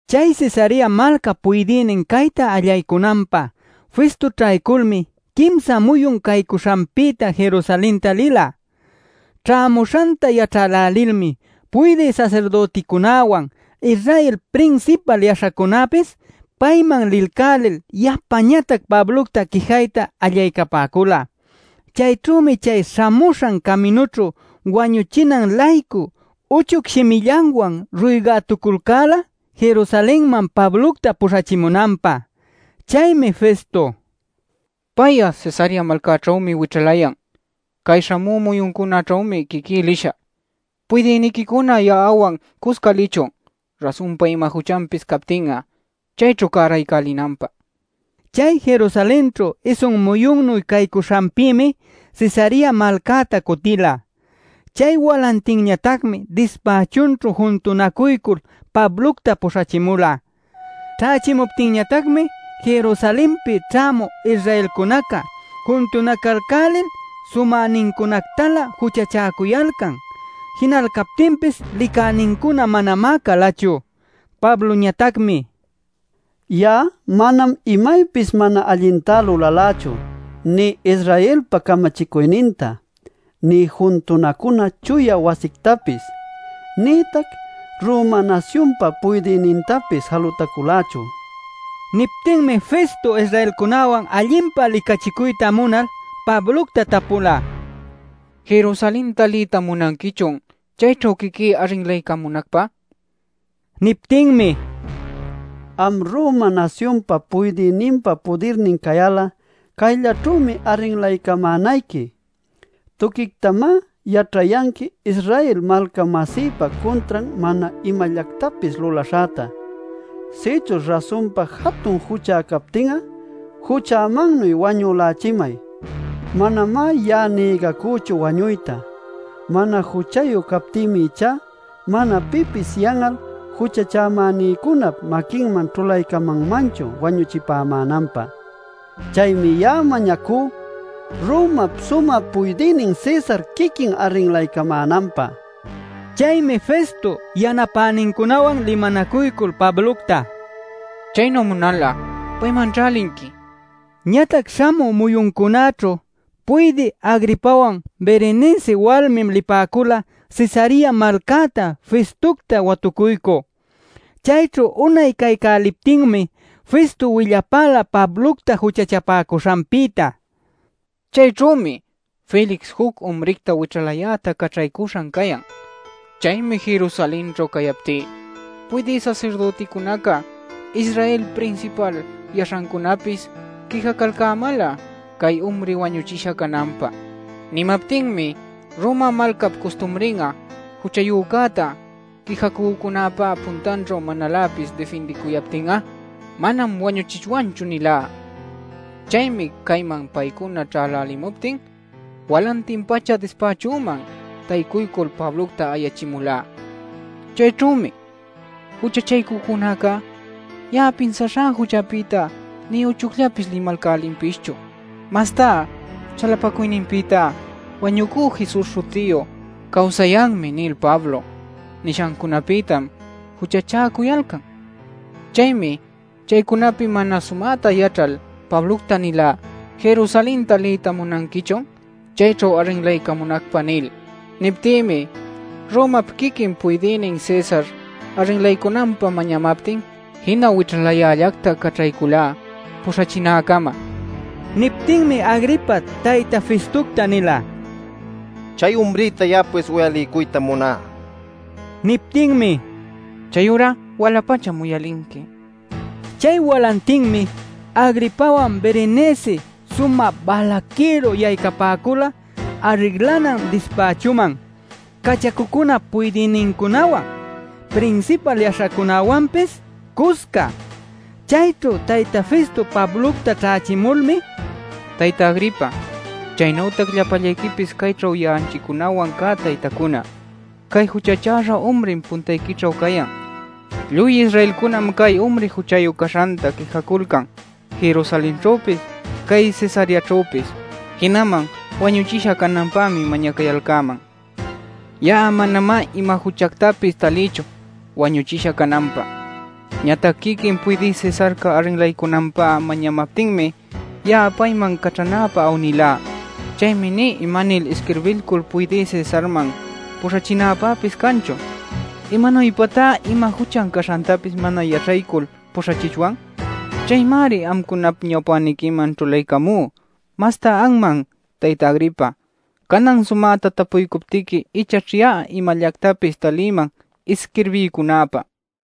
Chay Cesarea malcap puydïnin cayta allaycunanpä Festo ćhayculmi quimsa muyun caycuśhanpïta Jerusalenta lila. Ćhämuśhanta yaćhälälilmi puydï sasirdüticunäwan Israel prinsipal yaśhacunäpis payman lilcälil yapañatac Pablocta quijayta allaycapäcula. Chayćhümi chay śhamuśhan caminućhu wañuchinan-laycu uchuc shimillanwan ruygätuculcäla Jerusalenman Pablocta puśhachimunanpä. Chaymi Festo: “Pay'a Cesarea malcäćhümi wićhalayan. Cay śhamü muyuncunäćhümi quiquí lishä. Puydïniquicuna ya'awan cusca lichun, rasunpa ima juchanpis captin'a chayćhu cäraycälinanpä” nila. Chay Jerusalenćhu isun muyunnu caycuśhanpïmi Cesarea malcäta cutila. Chay walantinñatacmi dispächunćhu juntunacuycul Pablocta puśhachimula. Ćhächimuptinñatacmi Jerusalenpi ćhämü Israelcunaca juntunacaycälil sumäcunactalä juchachäcuyalcan. Jinayalcaptinpis licänincuna manamá calachu. Pabloñatacmi: “Ya'a manam imaypis mana allintá lulalächu, nï Israelpa camachicuyninta nï juntunacuna chuya wasictapis nïtac Roma nasyunpa puydïnintapis jalutaculächu” nila. Niptinmi Festo Israelcunäwan allinpa licachicuyta munal Pablocta tapula: “¿Jerusalenta liyta munanquichun chayćhu quiquí arrinlaycamunacpä?” nil. Niptinmi: “Am Roma nasyunpa puydïninpa pudirnin cayal'a cayllaćhümi arrinlaycamänayqui. Tuquictamá yaćhayanqui Israel malca-masïpä cuntran mana imallactapis lulaśhäta. Sïchuśh rasunpa jatun juchá captin'a juchämannuy wañülächimay. Manamá ya'a nïgacüchu wañuyta. Mana juchayu captïmi ichá mana pipis yan'al juchachämänïcunap maquinman ćhulaycamanmanchu wañuchipämänanpä. ¡Chaymi ya'a mañacú Romap sumä puydïnin Cesar quiquin arrinlaycamänanpä!” nila. Chaymi Festo yanapänincunawan limanacuycul Pablocta: “Chaynu munal'a paymanćhá linqui” nin. Ñatac śhamü muyuncunäćhu puydï Agripawan Berenice walmi lipäcula Cesarea malcäta Festocta watucuycü. Chayćhu unay capaycäliptinmi Festo willapäla Pablocta juchachapäcuśhanpïta: “Cayćhümi Felix juc umricta wićhalayäta caćhaycüśhan cayan. Chaymi Jerusalenćhu cayaptí puydï sasirdüticunaca, Israelpa prinsipal yaśhancunäpis quijacalcämäla chay umri wañuchisha cananpä. Nimaptinmi: ‘Roma malcap custumrin'a juchayücäta quijacücunäpä puntanćhu manaläpis difindicuyaptin'a manam wañuchichwanchu’ nilá. Chaymi cayman paycuna ćhälälimuptin walantin-pacha dispächüman taycuycul Pablocta ayachimulá. Chayćhümi juchachaycücunaca ya'a pinsaśhä juchapïtá nï uchucllapis limalcälinpischu. Mastá chalapacuyninpïta wañucü Jesus śhutiyu ‘cawsayanmi’ nil Pablo nishancunapïtam juchachäcuyalcan. Chaymi chaycunapi mana sumäta yaćhal Pablocta nilá: ‘¿Jerusalenta liyta munanquichun chayćhu arrinlaycunacpä?’ nil. Niptïmi Romap quiquin Puydïnin Cesar arrinlaycunanpä mañamaptin jina wićhalayällacta caćhayculá puśhachinäcama” nin. Niptinmi Agripa tayta Festocta nila: “Chay umricta ya'apis uyaliycuytam muná” nil. Niptinmi: “Chayurá wala-pacham uyalinqui” nin. Chay walantinmi Agripawan Berenice sumä balaquïru yaycapäcula arrinlanan dispächuman cachacucunap puydïnincunawan, prinsipal yaśhacunawanpis cusca. Chayćhu tayta Festo Pablocta ćhächimulmi: “Tayta Agripa, chaynütac llapallayquipis cayćhu ya'anchicunawan cä taytacuna, cay juchachäśha umrim puntayquićhu cayan. Lluy Israelcunam cay umri juchayu caśhanta quijaculcan Jerusalenćhüpis cay Cesareaćhüpis. Jinaman wañuchisha cananpämi mañacayalcäman. Ya'a manamá ima juchactapis talïchu wañuchisha cananpä. Ñatac quiquin Puydï Cesarca arrinlaycunanpä mañamaptinmi, ya'a payman caćhanäpä awnilá. Chaymi nï imanil isquirbilcul Puydï Cesarman puśhachinäpäpis canchu. ¿Imanuypatá ima juchan caśhantapis mana yaćhaycul puśhachichwan? Chaymari amcunap ñawpäniquiman ćhulaycamú, mastá anman tayta Agripa. Canan sumäta tapuycuptiqui ichaćh ya'a imallactapis talïman isquirbiycunäpä” nila.